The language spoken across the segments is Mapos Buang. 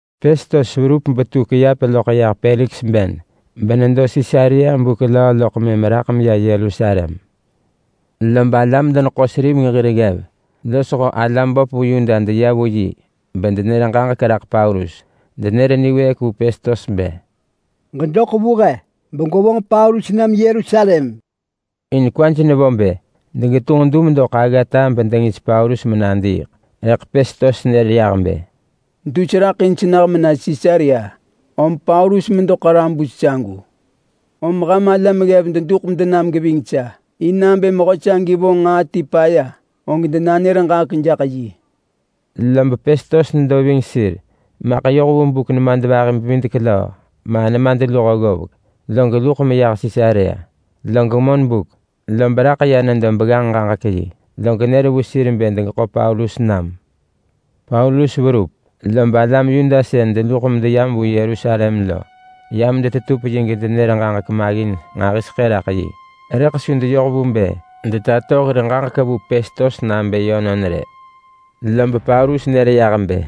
Pestos verup betu kiap loḳ yah Peliks ben benedo Sisarea buk löö loḳ mëm raḳ meya Yerusalem. Lob alam-deneḳo-seriveng hir ggev losho alam böp vu Yuda deya vu yi bedenër ġaġek raḳ Paulus. Denër niwëëk vu Pestos bë, “Ġedoḳ vu he, begwevonġ Paulus nam Yerusalem.” In kwaj nevo bë degetunġ dum doḳ aggata bedengis Paulus menadiiḳ. Rëḳ Pestos nër yah bë, “Dus raḳ in senah mena Sisarea, om Paulus medo ḳarabus sagu. Om ham alam ggev deduḳ medenam geving sa, in nabë mehö sagi vonġ nġaa ti paya, og denanër ġaġek jaḳ yi.” Lob Pestos nedo ving sir maḳ yoh vu buk nemadvahi-bevidek-löö ma nemadluho ggovek, log luḳ meyah Sisarea. Log monbuk lob raḳ ya nedo begganġ-ġaġek-yi, log nër vu sir bë degeḳo Paulus nam. Paulus verup lob alam Yuda sën deluḳ medeyam vu Yerusalem lo yam detetup yi gedenër ġaġek maggin nġahiseḳë raḳ yi. Rëḳ su deyoh vu bë detato hir ġaġek vu Pestos nabë yönon rë. Lob Paulus nër yah bë,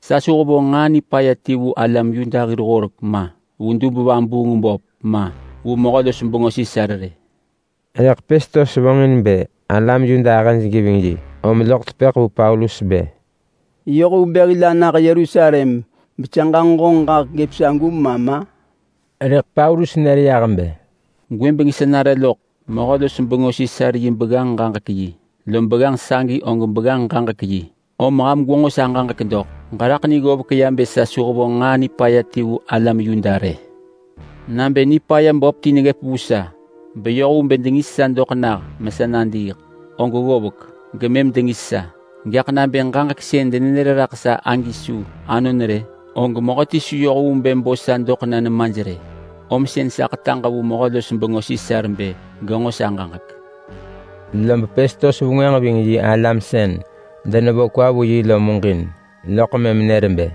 “Sa su hevonġ nġaa nipaya ti vu alam Yuda hir horek ma, vu dub-vabuung-böp ma, vu mehö-los-bengö Sisar rë.” Rëḳ Pestos vonġin bë alam Yuda ahëj geving yi om loḳ tepëḳ vu Paulus bë, “Yoh vu bë hil anah Yerusalem besa ġanġo honġ ġaġek gëp sagu ma ma?” Rëḳ Paulus nër yah bë, “Gwëbeng sa nare loḳ mehö-los-bengö Sisar yi begganġ-ġaġek-yi, lom begganġ sagi og begganġ-ġaġek-yi om ham gwenġo sa ġaġek doḳ! Ġeraḳ ni ggovek ya bë sa su hevonġ nġaa nipaya ti vu alam Yuda rë. Nabë nipaya böp ti neggëp vu sa beyoh vu bë dengis sa doḳ nah mesa nadiiḳ, og ggovek, gemëm dengis sa. Gaḳ nabë ġaġek sën denenër raḳ sa agi su anon rë, og mehöti su yoh vu bë bo sa doḳ na nemaj rë. Om sën sa ḳetaġ vu mehö-los-bengö Sisar bë genġo sa ġaġek.” Lob Pestos vengwënġ ving yi alam sën denevo kwa vu yi lo muġin, loḳ mëm nër bë,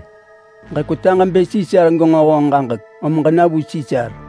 “Ġekwetaġ bë Sisar genġo honġ ġaġek, om ġena vu Sisar!”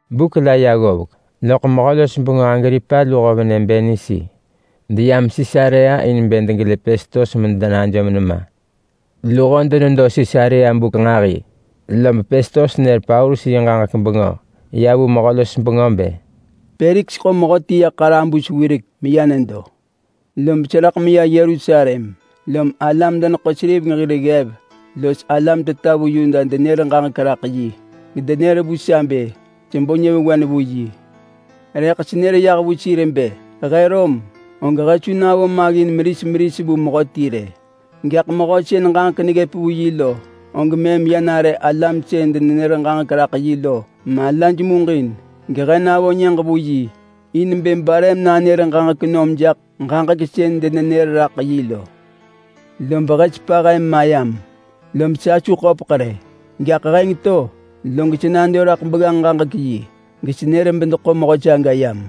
Buk la ya ggovek loḳ mehö-los-bengö Agripa luho venë Bernisi deyam Sisarea in bë degelë Pestos medenajom nema. Luho denedo Sisarea buk nġahi lob Pestos nër Paulus yi ġaġek bengö ya vu mehö-los-bengö bë, “Peliks ḳo mehöti ya ḳarabus wirek meya nedo. Lob seraḳ meya Yerusalem lom alam-deneḳo-seriveng hir ggev los alam teta vu Yuda denër ġaġek raḳ yi, gedenër vu sa bë sebo nyëvewen vu yi. Rëḳ senër yah vu sir bë he Rom, og he su navo maggin meris meris vu mehöti rë. Gaḳ mehö sën ġaġek neggëp vu yi lo, og mëm ya nare alam sën denenër ġaġek raḳ yi lo malaj muġin, gehe navo nyëġ vu yi in bë bare menanër ġaġek nom jaḳ ġaġek sën denenër raḳ yi lo. Lob he sepa he mayam, lob sa su köpeḳ rë. Gaḳ heng to log sa nado raḳ begganġ-ġaġek-yi gesenër bedeḳo mehö saga yam.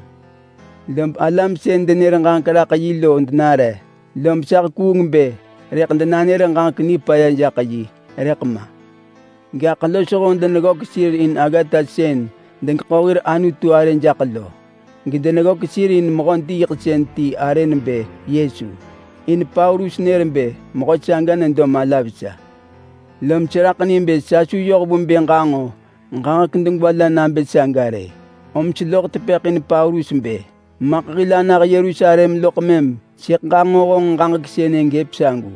Lob alam sën denër ġaġek raḳ yi lo denare. Lob sa hekuung bë rëḳ denanër ġaġek nipaya jaḳ yi, rëḳ ma. Gaḳ losho deneggök sir in aggata sën degeḳo hir ḳeriing lu nġaa jaḳ lo. Gedeneggök sir in mehö diiḳsën ti arë nebë Yesu, in Paulus nër bë mehö saga nedo mala vesa. Lom seraḳ ni bë sa su yoh vu bë ġanġo ġaġek degwa la nabë saga rë, om seloḳ tepëḳ in Paulus bë, ‘Maḳ hil anah Yerusalem loḳ mëm sëḳ ġanġo honġ ġaġek sënë gëp sagu.’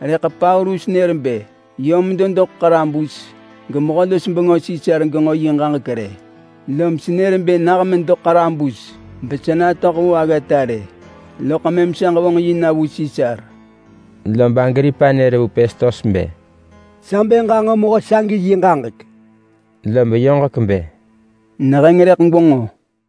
Rëḳ Paulus nër bë yö medo doḳ ḳarabus, gemehö-los-bengö Sisar genġo yi ġaġek rë. Lom senër bë nah medo ḳarabus besa natöḳ vu aggata rë, loḳ mëm sa ġevonġ yi na vu Sisar.” Lob Agripa nër vu Pestos bë, “Sa bë ġanġo mehö sagi yi ġaġek!” Lob yoġek bë, “Neheng rëḳ gwenġo!”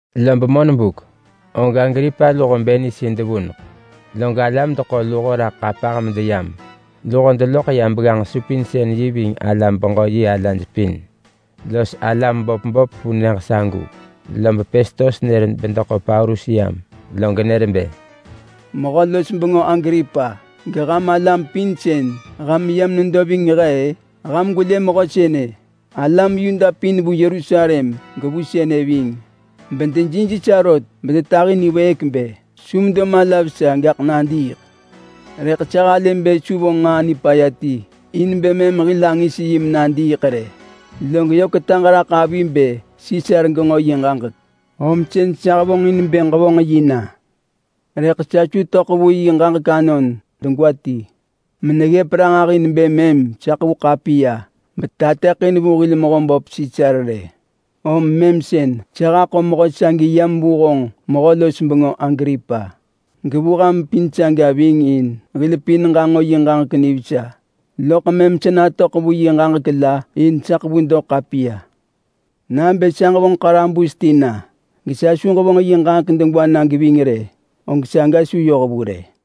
Lob monbuk lob Agripa luho Bernisi devuneḳ log alam deḳo luho raḳ ḳapah medeyam. Luho deloḳ ya begganġ-supinsën-yi ving alam-beġö-yi alaj pin, los alam böp böp vu nyëġ sagu, lob Pestos nër bedeḳo Paulus yam. Log nër bë, “Mehö-los-bengö Agripa, geham alam pin sën ham yam nedo ving he-ë, ham gwelë mehö sënë! Alam Yuda pin vu Yerusalem gevu sënë ving bedejij sa rot bedetahi niwëëk bë su medo mala vesa, gaḳ nadiiḳ. Rëḳ sa halë bë su vonġ nġaa nipaya ti in bë mëm hil angis yi menadiiḳ rë. Log yö ketaġ raḳ avi bë Sisar genġo yi ġaġek, om sën sa hevonġin bë ġevonġ yi na. Rëḳ sa su töḳ vu yi ġaġek anon degwa ti meneggëp ranġah in bë mëm sa ḳevu ḳapiya betateḳin vu hil mehöböp Sisar rë. Om mëm sën sa haḳo mehö sagi yam vu honġ mehö-los-bengö Agripa, gevu ham pin saga ving in hil pin ġanġo yi ġaġek nivesa, loḳ mëm sa natöḳ vu yi ġaġek la in sa ḳevu doḳ ḳapiya. Nabë sa ġevonġ ḳarabus ti na, gesa su ġevonġ yi ġaġek degwa na geving rë, og saga su yoh vu rë.”